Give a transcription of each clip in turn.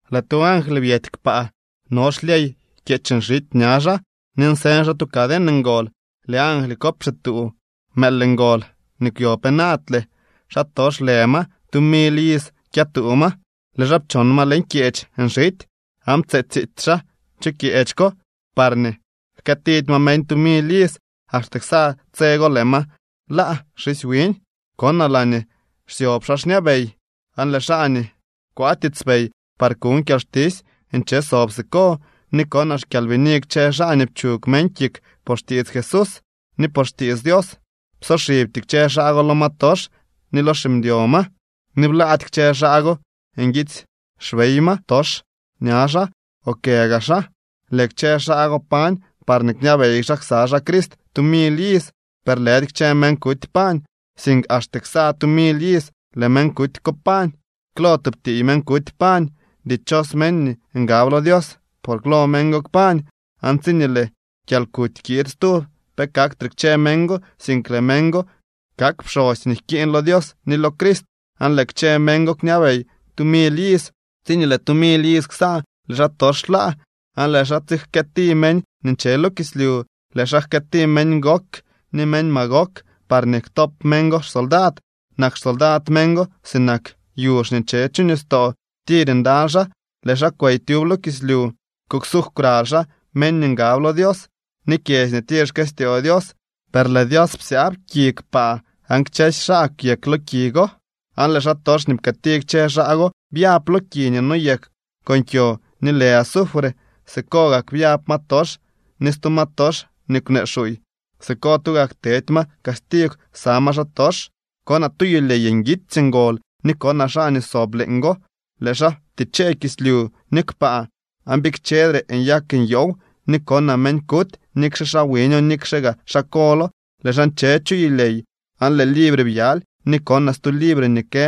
Lëë tu angly byety kpaa. No xlyey kyeech nxity ña xaa ni nseñ xaa tu caden ngol. Lëë angly ko pxituu mëël ngol nii kwyo penaadle. Xaa tox lë ma, tu mily iz kyëtuu ma. Lëë xaa pchon ma leñ kyeech nxity aan ptse tsiitsy xaa chu kyeech ko parñee jkëëtidy ma meñ tu mily iz. Axte ksa tse go lëë ma laa xisy wiñ. Konaa laañee xsyob xaa xñabey, aan lëë xaa nii kwaa tiitspey par kuñ kyalxtisy nche sob siko. Ni konaa xkyalbini kchë xaa nii pchug meñ kik por xtiits Jesús ni por xtiits Dios. Psoxibty kchë xaa go lo ma tox ni lo ximdyo ma, ni blaady kchë xaa go nguitsy xbey ma tox ña xaa o kë gaa xaa. Lëë kchë xaa go pañ parñee kñabey xaa ksa xaa Crist tu mily iz. Per lëdy kchë meñ kuty pañ, sink axte ksa tu mily iz lëë meñ kuty ko kpañ. Klo tub tiiy meñ kuty pañ. ¡Dichos meñ nii ngab lo Dios por klo meñ go kpañ! Aan tsiñee lëë kyalkuty kiid stub pe kaktre kchë meñ go, sink lëë meñ go kak pxosy nii jkiiñ lo Dios ni lo Crist, aan lëë kchë meñ go kñabey tu mily iz. Tsiñee lëë tu mily iz ksa lëë xaatox laa, aan lëë xaa tsijkëëti meñ nii nche lo kislyu. Lëë xaa jkëëti meñ Gog ni meñ Magog parñee ktop meñ go xsoldad. Nak xsoldad meñ go sinak yuzh nii nche chu nistoo. Tir ndaly xaa. Lëë xaa kwey tyub lo kislyu kuksuugw kwraly xaa meñ nii ngab lo Dios ni kyedzy nii tir xkëstyoo Dios. Per lëë Dios psyaab ki kpaa aan kchësy xaa kwyek lo ki go. Aan lëë xaatox nii pkëëti kchë xaa go byab lo ki nii noyek con kyo nii lë azufre. Siko gak byab ma tox ni stu ma tox nii kwnee xuuy. Siko tugak tedy ma castigw ksa ma xaatox. Konaa tu yulyey nguitsy ngol ni konaa xaa nii sob leeñgo. Lëë xaa ptichee kislyu ni kpaa aan bikchedre nyak nyoow. Ni konaa meñ kuty, nikxe xaa wiño nikxe gaa xaa kolo, lëë xaa nche chu yulyey aan lëë libre byaly ni konaa stu libre nii kë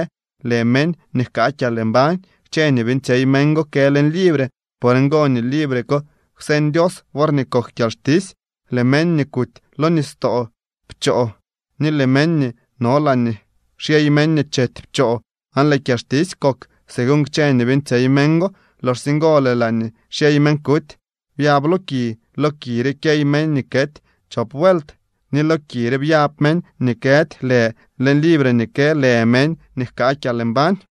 lë meñ nii jkaa kyalmbañ. Kchë nii beeñtsyey meñ go kë leñ libre. Por ngo nii libre ko kwseñ Dios worñee kok kyalxtisy. Lëë meñ nii kuty lo nistoo pchoo ni lëë meñ nii no laañee xyey meñ nii chety pchoo, aan lëë kyalxtisy kok según kchë nii beeñtsyey meñ go. Loxsye ngo lëë laañee xyey meñ kuty byab lo ki. Lo ki re kyey meñ nii kety chop vuelt. Ni lo ki re byab meñ nii këdy lë leñ libre ni kë lë meñ nii jkaa kyalmbañ.